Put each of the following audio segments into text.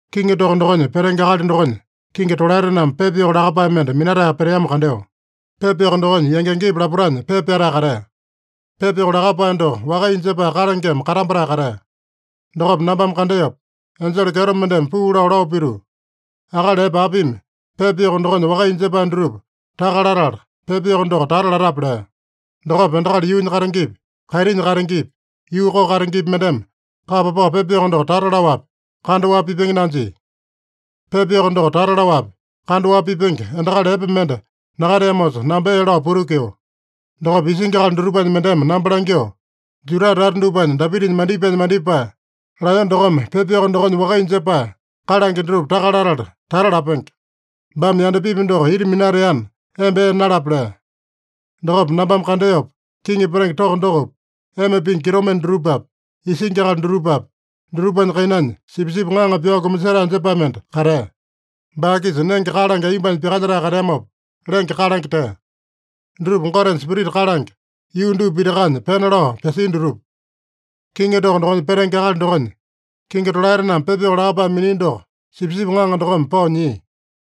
Kiŋi toko dokonya petenge akali dokonya kingi tolaetename pepa yoko lakapae mende minatae peteamo kandeo. Pepa yoko dokonya yangi-yangipa lapotanya pepa pyatae katea. Pepa yoko lakapae doko wakaiya jepae kalangeme katambatae katea. Dokopa nambame kandeopa, enjele kyeto mendeme puu lao, lao pituu, “Akali epe apimi pepa yoko dokonya wakaiya jepae dutupa taka latala, pepa yoko doko tata latape?” lea. Dokopa endakali yuunya katengepi, kaitinya katengepi, yuu koko katengepi mendeme kapa pao pepa yoko doko tata laowapi, kandaowapi pipenge nanjia. Pepa yoko doko tata laowapi, kandaowapi pipenge endakali epe mende nakateamosa, namba ee lao putukio. Dokopa isingi akali dutupanya mendeme namba langyoo, “Juda tata dupanya Dapitanya mandipaenya mandipae, Laeyone dokome pepa yoko dokonya wakaiya jepae kalange dutupa taka latala tata lapenge. Baame yandapipi doko ita minateana, emba ee nalape” lea. Dokopa nambame kandeopa, kiŋi petenge toko dokopi, ema pingi kitomende dutupapi, isingi akali dutupapi, dutupanya kainanya Sipisipi Ŋaŋa pyao kumasetae jepae mende katea. Baa-kisa nenge kalange aiyombanya pyakalyetae kateamopa, lenge kalange tea. Dutupa Gotenya spirita kalange, yuu dupa pitakanya pena lao pyasia dutupa. Kiŋi toko dokonya petenge akali dokonya kingi tolaetename pepa yoko lakapae minia doko Sipisipi Ŋaŋa dokome pao nyia.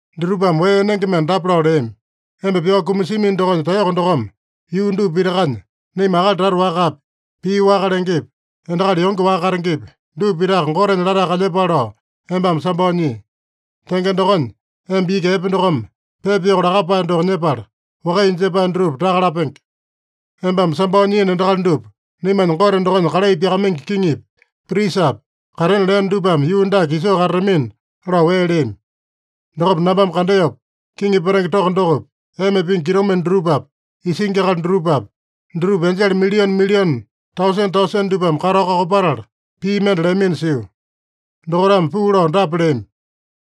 Dutupame wee enenge mende dapa lao leami: “Emba pyao kumasiamino dokonya taeyoko dokome yuu dupa pitakanya naima akali tata wakapi, pii waka lengepi, endakali yonge waka katengepi, dupa pitaka Gotenya latae kalyepale lao embame sambao nyii. Tenge dokonya, emba iki epe dokome pepa yoko lakapae doko nyepala, wakaiya jepae dutupa taka lapenge. Embame sambao nyiino endakali dupa naimanya Gote dokonya kalai pyakamaingi kiŋipi, prisapi katena leeno dupame yuu dake isoo katatamina” lao wee leami. Dokopa nambame kandeopa, kiŋi petenge toko dokopi, ema pingi kitomende dutupapi, isingi akali dutupapi, dutupa enjele milione-milione, tausene-tausene dupame katao kakopatala pii mende leamino sio. Dokaitame puu lao dapa leami: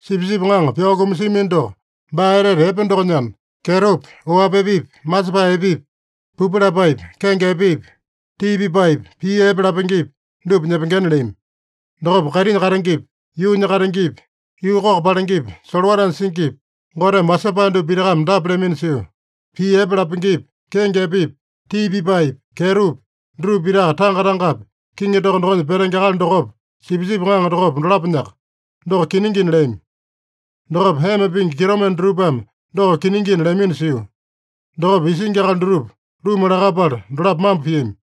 “Sipisipi Ŋaŋa pyao kumasiamino doko baa etete epe dokonyana, kyetopi, oapi epepi, masepae epepi, pupu lapaepi, kenge epepi, tii pipaepi, pii epe lapengepi, dupa nyepengena” leami. Dokopa kaitinya katengepi, yuunya katengepi, yuu koko palengepi, solowatanya singipi, Goteme wasepae dupa pitakame dapa leamino sio: “Pii epe lapengepi, kenge epepi, tii pipaepi, kyetopi, dutupa pitaka tanga-tangapi kiŋi toko dokonya petenge akali dokopa, Sipisipi Ŋaŋa dokopa, dolaponyaka. Doko kiningina” leami. Dokopa ema pingi kitomende dutupame “Doko kiningina” leamino sio. Dokopa isingi akali dutupa luma lakapala dolapo mambo piami.